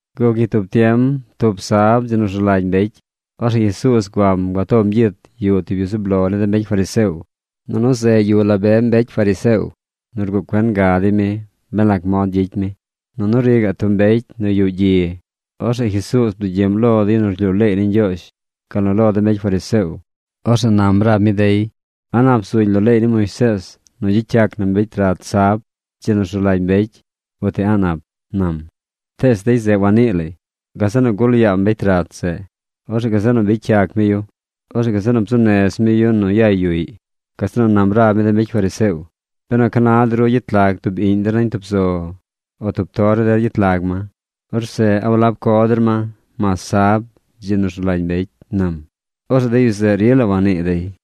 Guc ñi tub tiem, tub sab, dzi nu rzu lagy mbecy, orzeꞌ Jesuuz guam gua tom gyit yuꞌ tub yu zub lo ni de mbecy fariseo. Nunu zeꞌ yuꞌ la be mbecy fariseo nu rguꞌ cuen ga dey mi ben lac mod gyicy mi. Nunu ri gaꞌ tub mbecy nu yuꞌ gyi. Orzeꞌ Jesuuz bdugyiꞌm lo de yu nu rlyuu leey ni Ñgyoozh gal nu lo de mbecy fariseo. Orzeꞌ nam rab mi dey: ―¿A nap zuñ lo leey ni Moisees nu gyicy yac na mbecy rat sab, dzi nu rzu lagy mbecy, uti a̱ꞌ nap? ―nam. Tees dey zeꞌ wanii lay. Gazeꞌ nu gul yaam mbecy rat zeꞌ. Orzeꞌ gazeꞌ nu bicy yac mi yu. Orzeꞌ gazeꞌ nu bzuu nez mi yu yay yuꞌy. Gazeꞌ nu nam rab mi de mbecy fariseo: ―Benu ca na de ru gyet lag tub iꞌñ der nañ tub zo, o tub tor ni der gyet lag ma, orzeꞌ ¿a walab co der ma, mas sab, dzi nu rzu lagy mbecy? ―nam. Orzeꞌ de yu zeꞌ rila wannii dey.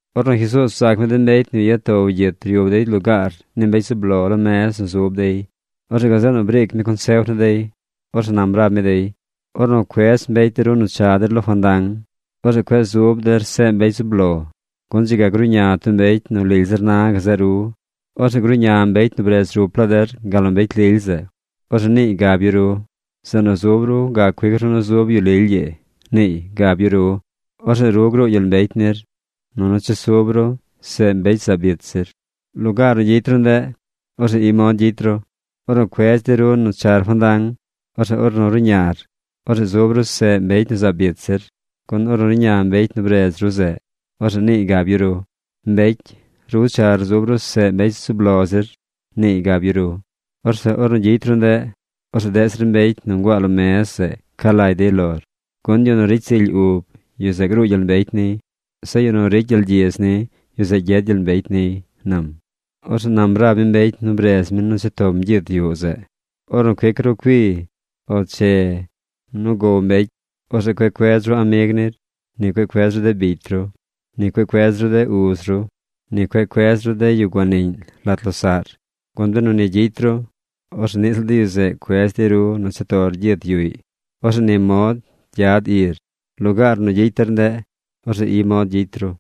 Ornu Jesuuz bzaac mi de mbecy nu ya tow gyit ryub dey lugaar ni mbecy zub lo lo mez nu zub dey, orzeꞌ gazeꞌ nu briic mi consef ni dey. Orzeꞌ nam rab mi dey: ―Ornu cuedz mbecy de ru nu cha der lo fandang, orzeꞌ cueꞌ zub der seꞌ mbecy zub lo, gun dzi ga gruꞌña tub mbecy nu lily zir na gazeꞌ ru. Orzeꞌ gruꞌña mbecy nu bredz rup laa der gal nu mbecy lily zeꞌ. Orzeꞌ niiy gab yu ru: “Zeꞌ nu zub ru gac cuic ru nu zub yu lily ii”, niiy gab yu ru. Orzeꞌ ru gruu gyel mbecy nir, nunu chesub ru seꞌ mbecy zaab ich zir. Lugaar nu gyicy ru ndeꞌ, orzeꞌ i mod gyicy ru: Ornu cuedz dey ru nu char fandang, orzeꞌ ornu ruꞌñar, orzeꞌ zub ru seꞌ mbecy nu zaab ich zir. Gun ornu ruꞌña mbecy nu bredz ru zeꞌ, orzeꞌ niiy gab yu ru: “Mbecy, ru char zub ru seꞌ mbecy zub lo zir”, niiy gab yu ru. Orzeꞌ ornu gyicy ru ndeꞌ, orzeꞌ deꞌ zir mbecy nu nguaa lo mez zeꞌ ca lagy dey lor. Gun yu nu ricy zily ub, yu zeꞌ gruu gyel mbecy niy. Zeꞌ yu nu ricy gyel gyidz ni, yu zeꞌ gyed gyel mbecy niy ―nam. Orzeꞌ nam rab mi mbecy nu bredz mi nu cha tom gyit yuꞌ zeꞌ: ―Ornu cuic ru cui o che nu gow mbecy, orzeꞌ cueꞌ cuedz ru amig nir. Ni cueꞌ cuedz ru de bicy ru. Ni cueꞌ cuedz ru de uz ru. Ni cueꞌ cuedz ru de yu guaniꞌñ lat losaꞌr. Gun benu ni gyicy ru, orzeꞌ niꞌ ziꞌl de yu zeꞌ cuedz dey ru nu cha tor gyit yuꞌy. Orzeꞌ ni mod gyad ir. Lugaar nu gyicy der ndeꞌ, orzeꞌ i mod gyicy ru.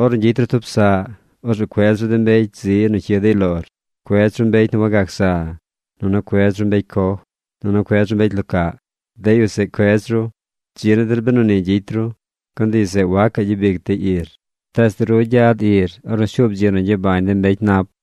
Ornu gyicy ru tub saꞌ, orzeꞌ cuedz ru de mbecy zi nu cyid dey lor. Cuedz ru mbecy nu wagac za, nunu cuedz ru mbecy coj, nunu cuedz ru mbecy lo caꞌ. De yu zeꞌ cuedz ru. Dzi ni der benu ni gyicy ru. Gun de yu zeꞌ wacaꞌ gyabic dey ir. Tees ru gyad ir ornu shuub dzi nu gyabañ de mbecy nap.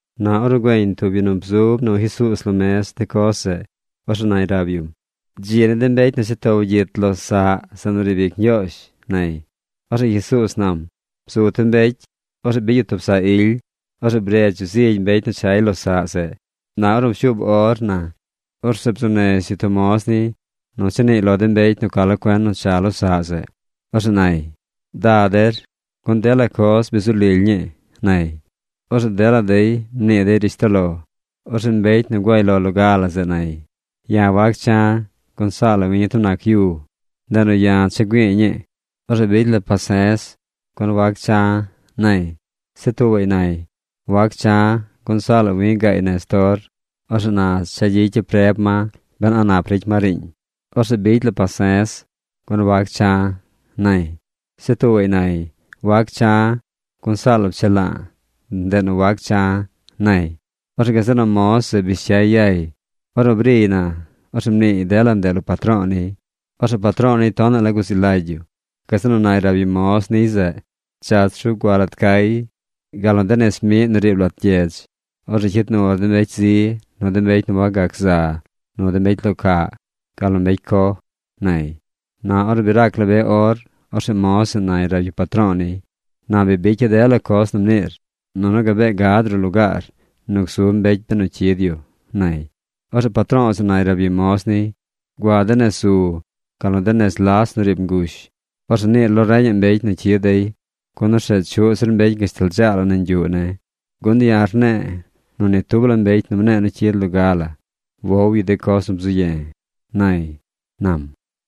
Na ornu güeñ tub yu nu bzub nu Jesuuz lo mez de coz zeꞌ, orzeꞌ nay rab yum: ―¡Dzi ni de mbecy nu cha tow gyit lo saꞌ zeꞌ nu riib ic Ñgyoozh! ―nay. Orzeꞌ Jesuuz nam: ―Bzu tub mbecy. Orzeꞌ bicy yu tub saꞌ ily. Orzeꞌ bredz yu zigy mbecy nu chay lo saꞌ zeꞌ. Na ornu pshuub or na, orzeꞌ bzuu nez yu tub moz niy nu cha niiy lo de mbecy nu ca lo cuen nu cha lo saꞌ zeꞌ. Orzeꞌ nay: “Da der, gun dela coz bi zu lily ñii”, nay. Orzeꞌ dela dey mnii dey rishtoꞌ lo. Orzeꞌ mbecy nu guay lo loga la zeꞌ nay: “Ya̱ wac cha̱, gun saa la wi tub nac yu. Ndeꞌ nu ya̱ cha güi̱i̱ ñii. Orzeꞌ bicy sulagy ne̱, gun wac cha̱”, nay. Zeꞌ tuubaꞌy nay: “Wac cha̱, gun saa la wi̱ gaay nez tor. Orzeꞌ na cha̱ gyicya̱ preb ma ben a nap ricy ma riiñ. Orzeꞌ bicy sulagy ne̱, gun wac cha̱”, nay. Zeꞌ tuubaꞌy nay: “Wac cha̱, gun saa la pchela̱a̱. Ndeꞌ nu wac cha̱”, nay. Orzeꞌ gazeꞌ nu moz zeꞌ bish cyay yay. Ornu briy na, orzeꞌ mniiy dela ndeꞌ lo patro̱o̱ niy. Orzeꞌ patro̱o̱ niy tonaꞌ la guzi lagy yu. Gazeꞌ nu nay rab yu moz niy zeꞌ: “Dzach ru gua lat cay, gal nu de nez miꞌ nu riib lat gyedz. Orzeꞌ cyid nur de mbecy zi, nu de mbecy nu wagac za, nu mbecy lo caꞌ, gal nu mbecy coj”, nay. Na ornu bi rac la be or, orzeꞌ moz zeꞌ nay rab yu patro̱o̱ niy: “Na bi bicya̱ dela coz nu mniir, nunu gabee gad ruꞌ lugaar nu gzub mbecy benu cyid yu”, nay. Orzeꞌ patro̱o̱ zeꞌ nay rab yu moz niy: “Gua de nez zu gal nu de nez las nu riib ngush. Orzeꞌ niir lo reñaꞌ mbecy nu cyid dey, gun orzeꞌ chuꞌ zir mbecy gashtal dzaa la nañ yuꞌ ne̱. Gun ya̱ rne̱e̱ nu ni tub la mbecy nu mne̱e̱ nu cyid nu loga la wow yu de coz nu bzu ye̱”, nay ―nam.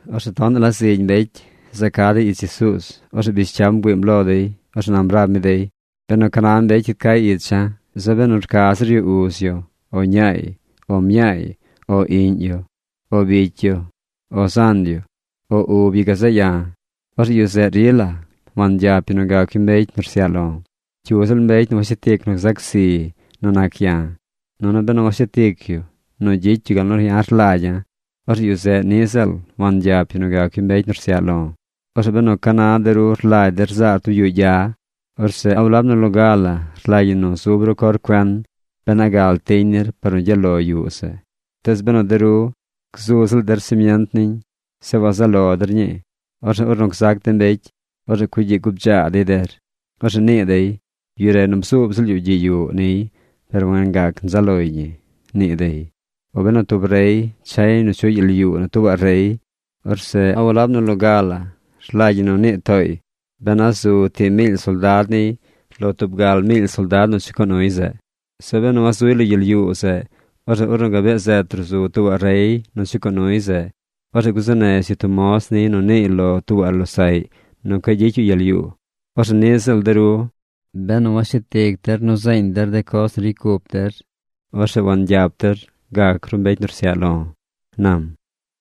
Orzeꞌ tonaꞌ la zigy mbecy za ca dey ich Jesuuz. Orzeꞌ bish cyam bgüiim lo dey. Orzeꞌ nam rab mi dey: ―Benu ca na mbecy cyid cay icha̱, zeꞌ benu rca zir yu uz yu, o ñaay, o mñaay, o iꞌñ yu, o bicy yu, o zan yu, o ub yu gazeꞌ ya̱, orzeꞌ yu zeꞌ rila wangyap yu nu gac yu mbecy nu rsyaꞌ lo̱. Cyu ziꞌl mbecy nu washet ic nu gzac zi nu nac ya̱, nunu benu washet ic yu nu gyicy yu gal nu ya̱ rlagya̱, orzeꞌ yu zeꞌ niꞌ ziꞌl wangyap yu nu gac yu mbecy nu rsyaꞌ lo̱. Orzeꞌ benu ca na de ru rlagy der zaar tub yuꞌ gya, orzeꞌ ¿a walab nu loga la rlagy ñi nu zub ru cor cuen ben a gal tiñ nir par nu gyaꞌ lo yuꞌ zeꞌ? Tees benu de ru gzu ziꞌl der simient niñ, zeꞌ wazaꞌ lo der ñii, orzeꞌ ornu gzac de mbecy, orzeꞌ cugyiꞌ gubdzaa dey der. Orzeꞌ nii dey: “Yu re nu bzuub ziꞌl yu gyiꞌ yuꞌ niy per wangac nzaꞌ loy ñi”, nii dey. O benu tub rey chay nu chuꞌy gyel yuu nu tuubaꞌ rey, orzeꞌ ¿a walab nu loga la rlagy ñi nu nii tooy ben a zu tii miily soldad niy lo tub gal miily soldad nu chucoo nuy zeꞌ? Zeꞌ benu wazuy lo gyel yuu zeꞌ, orzeꞌ ornu gabee zet ruꞌ zu tuubaꞌ rey nu chucoo nuy zeꞌ, orzeꞌ gzuu nez yu tub moz niy nu niiy lo tuubaꞌ losaꞌy nu cueꞌ gyicy yu gyel yuu. Orzeꞌ niꞌ ziꞌl de ru. Benu washet ic der nu zeeñ der de coz nu ricy cup der, orzeꞌ wangyap der gac ru mbecy nu rsyaꞌ lo̱ ―nam―.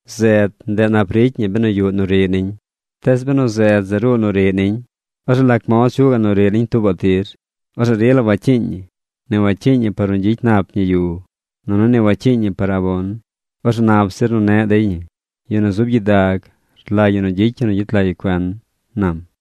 ’Zed, ndeꞌ nap ricy ñi benu yuꞌ nu riꞌ niñ. Tees benu zed zeꞌ ruu nu riꞌ niñ, ¿orzeꞌ lac mod chuꞌ gaꞌ nu riꞌ niñ tuubaꞌ tir? Orzeꞌ rila wacyiiñ ñi. Ni wacyiiñ ñi nu gyicy nap ñi yu. Nunu ni wacyiiñ ñi par abon. Orzeꞌ nap zir nu neꞌ dey ñi. Yu nu zub gyidag, rlagy ñi gyicy yu nu gyet lag yu cuen ―nam.